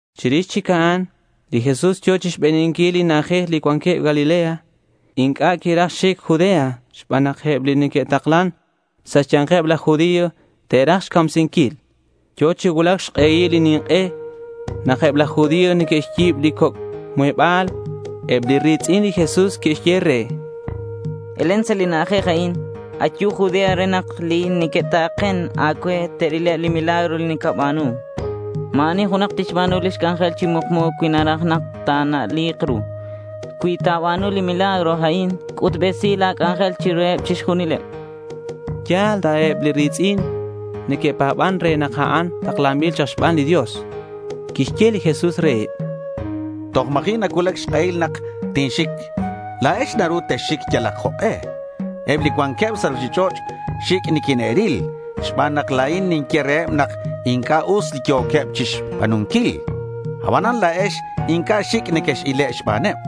Chirix chic a'an, li Jesús yo̱ chixbeninquileb li na'ajej li cuanqueb Galilea. Inc'a' quiraj xic Judea xban nak eb li neque'taklan sa' xya̱nkeb laj judío te'raj xcamsinquil. Yo̱ chi cuulac xk'ehil li nink'e nak eb laj judío neque'xyi̱b lix coc' muheba̱l. Eb li ri̱tz'in li Jesús que'xye re: —Elen sa' li na'ajej a'in. Ayu Judea re nak eb li neque'ta̱ken a̱cue te'rileb li milagro li nacaba̱nu. Ma̱ ani junak tixba̱nu lix c'anjel chi mukmu cui naraj nak ta̱na'li̱k ru. Cui ta̱ba̱nu li milagro a'in, c'utbesi la̱ c'anjel chiruheb chixjunileb, chanqueb. Yal ta eb li ri̱tz'in neque'pa̱ban re nak a'an taklanbil chak xban li Dios. Quixye li Jesús reheb: —Toj ma̱ji' nacuulac xk'ehil nak tinxic. La̱ex naru texxic yalak jok'e. Eb li cuanqueb sa' ruchich'och' xic' niquine'ril xban nak la̱in ninye reheb nak inc'a' us li yo̱queb chixba̱nunquil. Abanan la̱ex inc'a' xic' nequex-ile' xbaneb.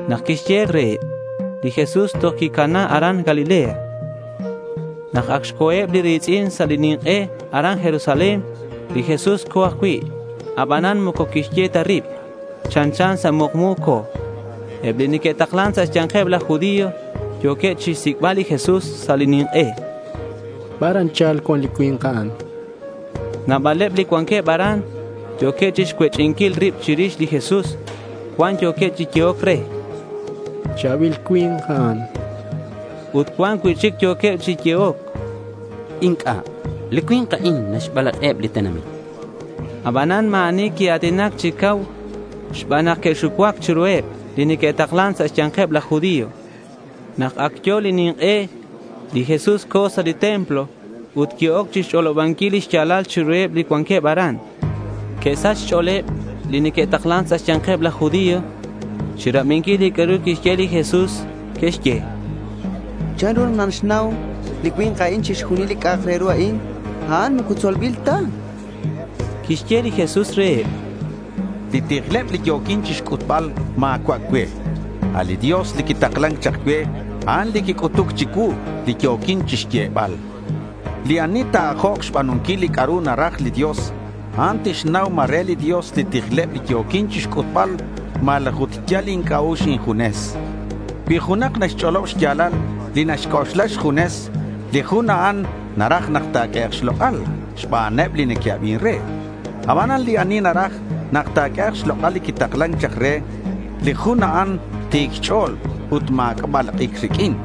Nak quixye reheb a'in, li Jesús toj quicana aran Galilea. Nak ac xco̱eb li ri̱tz'in sa' li nink'e aran Jerusalén, li Jesús co̱ ajcui'. Abanan moco quixye ta rib. Chanchan sa' mukmu co̱. Eb li neque'taklan sa' xya̱nkeb laj judío yo̱queb chixsic'bal li Jesús sa' li nink'e. —¿Bar anchal cuan li cui̱nk a'an? chanqueb. Nabaleb li cuanqueb aran yo̱queb chixcuech'inquil rib chirix li Jesús. Cuan yo̱queb chi yehoc re: —Cha̱bil cui̱nk a'an, chanqueb. Ut cuan cui'chic yo̱queb chi yehoc: —Inc'a'. Li cui̱nk a'an naxbalak'iheb li tenamit, chanqueb. Abanan ma̱ ani quia̱tinac chi cau xban nak que'xucuac chiruheb li neque'taklan sa' xya̱nkeb laj judío. Nak ac yo̱ li nink'e li Jesús co̱ sa' li templo ut qui-oc chixch'olobanquil li xya̱lal chiruheb li cuanqueb aran. Que'sach xch'o̱leb li neque'taklan sa' xya̱nkeb laj judío chirabinquil li c'a'ru quixye li Jesús. Que'xye: —¿Chanru nak naxnau li cui̱nk a'in chixjunil li c'a'ak re ru a'in? A'an moco tzolbil ta, chanqueb. Quixye li Jesús reheb: —Li tijleb li yo̱quin chixc'utbal ma̱cua' cue. A' li Dios li quitaklan chak cue, a'an li quic'utuc chicuu li yo̱quin chixyebal, chan. Li ani ta̱ajok xba̱nunquil li c'a'ru naraj li Dios, a'an tixnau ma re li Dios li tijleb li yo̱quin chixc'utbal malaj ut yal inc'a'ux injunes. Cui junak naxch'olob xya̱lal li naxc'oxla xjunes, li jun a'an naraj nak ta̱q'uehek' xlok'al xbaneb li neque'abin re. Abanan li ani naraj nak ta̱q'uehek' xlok'al li quitaklan chak re, li jun a'an ti̱c xch'o̱l ut ma̱c'a' balak'ic riq'uin.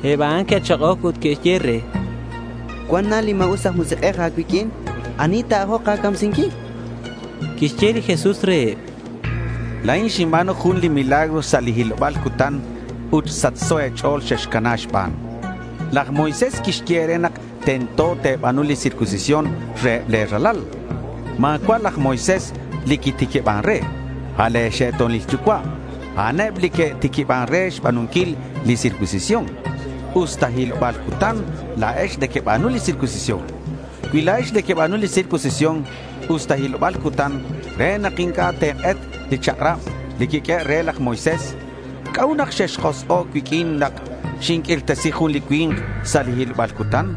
Eb a'an que'chak'oc ut que'xye re: —Cuan na li ma̱us aj musik'ej a̱cuiq'uin. ¿Ani ta̱ajok a̱camsinquil? chanqueb re. Quixye li Jesús reheb: —La̱in xinba̱nu jun li milagro sa' li hiloba̱l cutan ut sachso e̱ch'o̱l xexcana xban. Laj Moisés quixye e̱re nak tento te̱ba̱nu li circuncisión reheb le̱ ralal. (Ma̱cua' laj Moisés li quitiquiban re. A' le̱ xe'to̱nil yucua', a'aneb li que'tiquiban re xba̱nunquil li circuncisión.) Usta hiloba̱l cutan, la̱ex nequeba̱nu li circuncisión. Cui la̱ex nequeba̱nu li circuncisión usta hiloba̱l cutan re nak inc'a' te̱k'et li chak'rab li quiq'uehe' re laj Moisés, ¿c'a'ut nak xexjosk'o' cuiq'uin nak xinq'uirtesi jun li cui̱nk sa' li hiloba̱l cutan?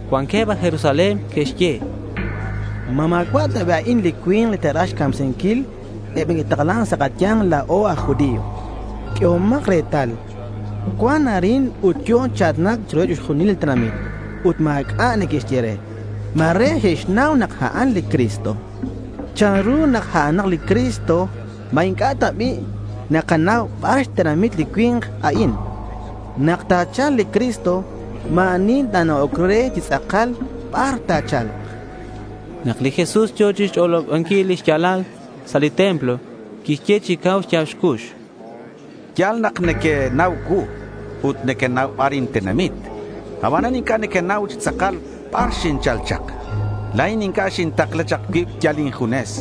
Cuanqueb aj Jerusalén que'xye: —¿Ma ma̱cua' ta bi' a'in li cui̱nk li te'raj xcamsinquil eb li neque'taklan sa' kaya̱nk la̱o aj judío? Q'uehomak retal. Cuan arin ut yo̱ chi a̱tinac chiruheb chixjunileb li tenamit ut ma̱c'a' neque'xye re. Ma̱re xe'xnau nak a'an li Cristo. ¿Chanru nak a'anak li Cristo? ¿Ma inc'a' ta bi' nakanau bar xtenamit li cui̱nk a'in? Nak ta̱cha̱lk li Cristo, ma̱ ani ta̱na'ok re chi tz'akal bar ta̱cha̱lk chak, chanqueb. Nak li Jesús yo̱ chixch'olobanquil li xya̱lal sa' li templo, quixye chi cau xya̱b xcux: —Ya̱l nak nequenau cuu. Ut nequenau bar intenamit. Abanan inc'a' nequenau chi tz'akal bar xinchal chak. La̱in inc'a' xintakla chak cuib yal injunes.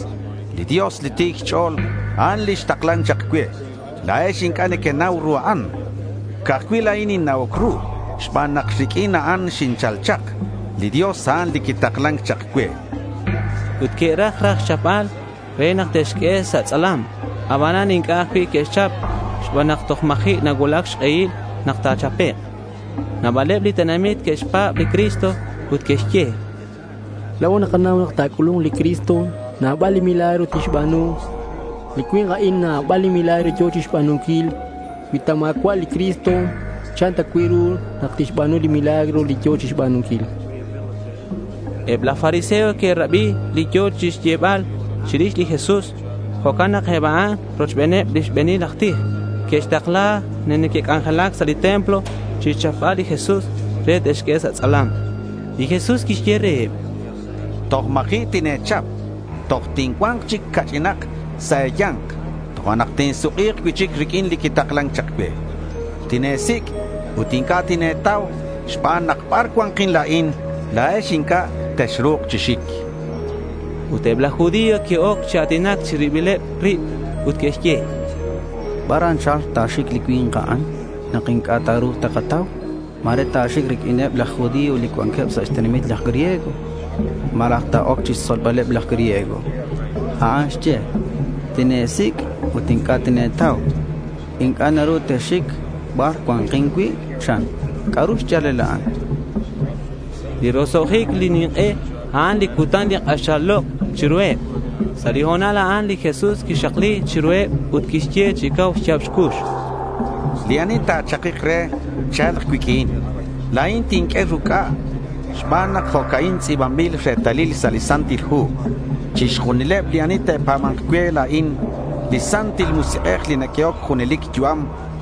Li Dios, li ti̱c xch'o̱l, a'an li xtaklan chak cue. La̱ex inc'a' nequenau ru a'an. Ca'aj cui' la̱in ninna'oc ru xban nak riq'uin a'an xinchal chak. Li Dios, a'an li quitaklan chak cue, chan li Jesús. Ut que'raj raj xchapbal re nak te'xq'ue sa' tz'alam. Abanan inc'a' ajcui' que'xchap xban nak toj ma̱ji' nacuulac xk'ehil nak ta̱chapek'. Nabaleb li tenamit que'xpa̱b li Cristo ut que'xye: —La̱o nakanau nak ta̱c'ulu̱nk li Cristo, nabaleb li milagro tixba̱nu. Li cui̱nk a'in nabal li milagro yo̱ chixba̱nunquil. Cui ta ma̱cua' li Cristo, ¿chan ta cui' ru nak tixba̱nu li milagro li yo̱ chixba̱nunquil? Eb laj fariseo que'rabi li yo̱queb chixyebal chirix li Jesús. Jo'can nak eb a'an, rochbeneb li xbe̱nil aj tij, que'xtakla li neque'c'ac'alen sa' li templo chixchapbal li Jesús re te'xq'ue sa' tz'alam. Li Jesús quixye reheb: —Toj ma̱ji' tine̱chap. Toj tincua̱nk chic ca'ch'inak sa' e̱ya̱nk, tojo'nak tinsuk'i̱k cui'chic riq'uin li quitaklan chak cue. Tine̱sic' ut inc'a' tine̱tau xban nak bar cua̱nkin la̱in, la̱ex inc'a' texru̱k chi xic, chan. Ut eb laj judío que'oc chi a̱tinac chi ribileb rib ut que'xye: —¿Bar anchal ta̱xic li cui̱nk a'in nak inc'a' ta̱ru̱k takatau? Ma̱re ta̱xic riq'uineb laj judío li cuanqueb sa' xtenamiteb laj griego. Malaj ta̱oc chixtzolbaleb laj griego. A'an xye, “Tine̱sic' ut inc'a' tine̱tau. Inc'a' naru texxic bar cua̱nkin cui',” chan. ¿C'a'ru xya̱lal a'an? chanqueb. Li roso'jic li nink'e, a'an li cutan li k'axal lok' chiruheb. Sa' li ho̱nal a'an, li Jesús quixakli chiruheb ut quixye chi cau xya̱b xcux: —Li ani ta̱chakik re, cha̱lk cuiq'uin. La̱in tinq'ue ruc'a. Xban nak jo'ca'in tz'i̱banbil retalil sa' li Santil Hu: Chixjunileb li ani te'pa̱ba̱nk cue la̱in, li Santil Musik'ej li naq'uehoc junelic yu'am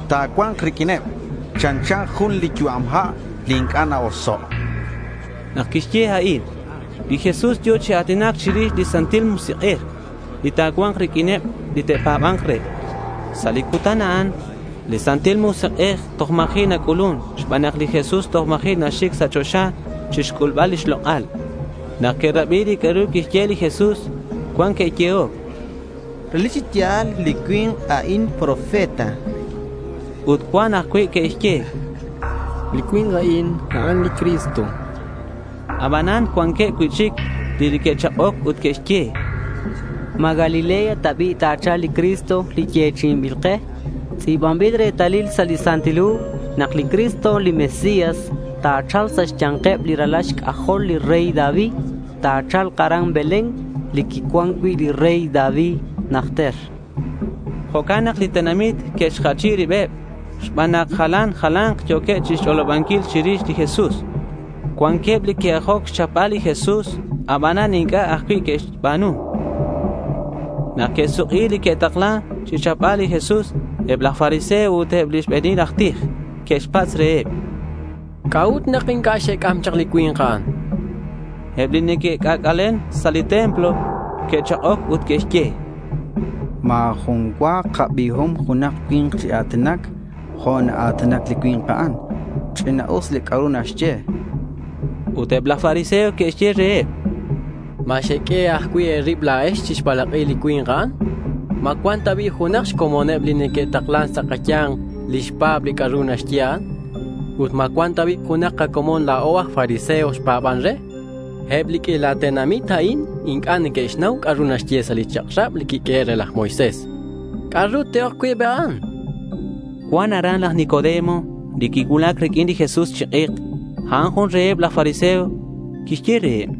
ta̱cua̱nk riq'uineb. Chanchan jun li yu'am ha' li inc'a' na-oso'.— Nak quixye a'in, li Jesús yo̱ chi a̱tinac chirix li Santil Musik'ej li ta̱cua̱nk riq'uineb li te'pa̱ba̱nk re. Sa' li cutan a'an, li Santil Musik'ej toj ma̱ji' nac'ulun xban nak li Jesús toj ma̱ji' naxic sa' choxa chixc'ulbal lix lok'al. Nak que'rabi li c'a'ru quixye li Jesús, cuan que'yehoc: —Relic chi ya̱l li cui̱nk a'in profeta.— Ut cuanqueb ajcui' que'xye: —Li cui̱nk a'in, a'an li Cristo.— Abanan cuanqueb cui'chic li que'chak'oc ut que'xye: —¿Ma Galilea ta bi' ta̱cha̱lk li Cristo li yechi'inbil ke? Tz'i̱banbil retalil sa' li Santil Hu nak li Cristo li Mesías ta̱cha̱lk sa' xya̱nkeb li ralal xc'ajol li rey David. Ta̱cha̱lk aran Belén li quicuan cui' li rey David najter, chanqueb. Jo'can nak li tenamit que'xjachi ribeb xban nak jalan jala̱nk yo̱queb chixc'oxlanquil chirix li Jesús. Cuanqueb li que'ajoc xchapbal li Jesús abanan inc'a' ajcui' que'xba̱nu. Nak que'suk'i li que'takla̱c chixchapbal li Jesús, eb laj fariseo ut eb li xbe̱nil aj tij que'xpatz' reheb: —¿C'a'ut nak inc'a' xec'am chak li cui̱nk a'an? chanqueb. Eb li neque'c'ac'alen sa' li templo que'chak'oc ut que'xye: —¡Ma̱ jun cua kabiom junak cui̱nk chi a̱tinac jo' naa̱tinac li cui̱nk a'an! Ch'ina'us li c'a'ru naxye, chanqueb. Ut eb laj fariseo que'xye reheb: —¿Ma xeq'ue ajcui' e̱rib la̱ex chixbalak'i li cui̱nk a'an? ¿Ma cuan ta bi' junak xcomoneb li neque'taklan sa' kaya̱nk li xpa̱b li c'a'ru naxye a'an? Ut, ¿ma cuan ta bi' junak kacomon la̱o aj fariseo xpa̱ban re? Eb li q'uila tenamit a'in inc'a' neque'xnau c'a'ru naxye sa' li chak'rab li quiq'uehe' re laj Moisés. ¿C'a'ru te'oc cui' eb a'an? chanqueb laj fariseo. Cuan aran laj Nicodemo li quicuulac riq'uin li Jesús chi k'ek. A'an jun reheb laj fariseo. Quixye reheb: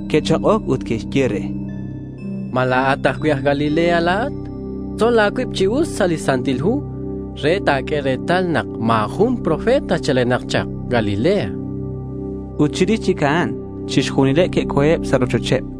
Que'chak'oc ut que'xye re: —¿Ma la̱at ajcui' aj Galilea la̱at? Tzol a̱cuib chi us sa' li Santil Hu re ta̱q'ue retal nak ma̱ jun profeta chalenak chak Galilea, chanqueb. Ut chirix chic a'an, chixjunileb que'co̱eb sa' rochocheb.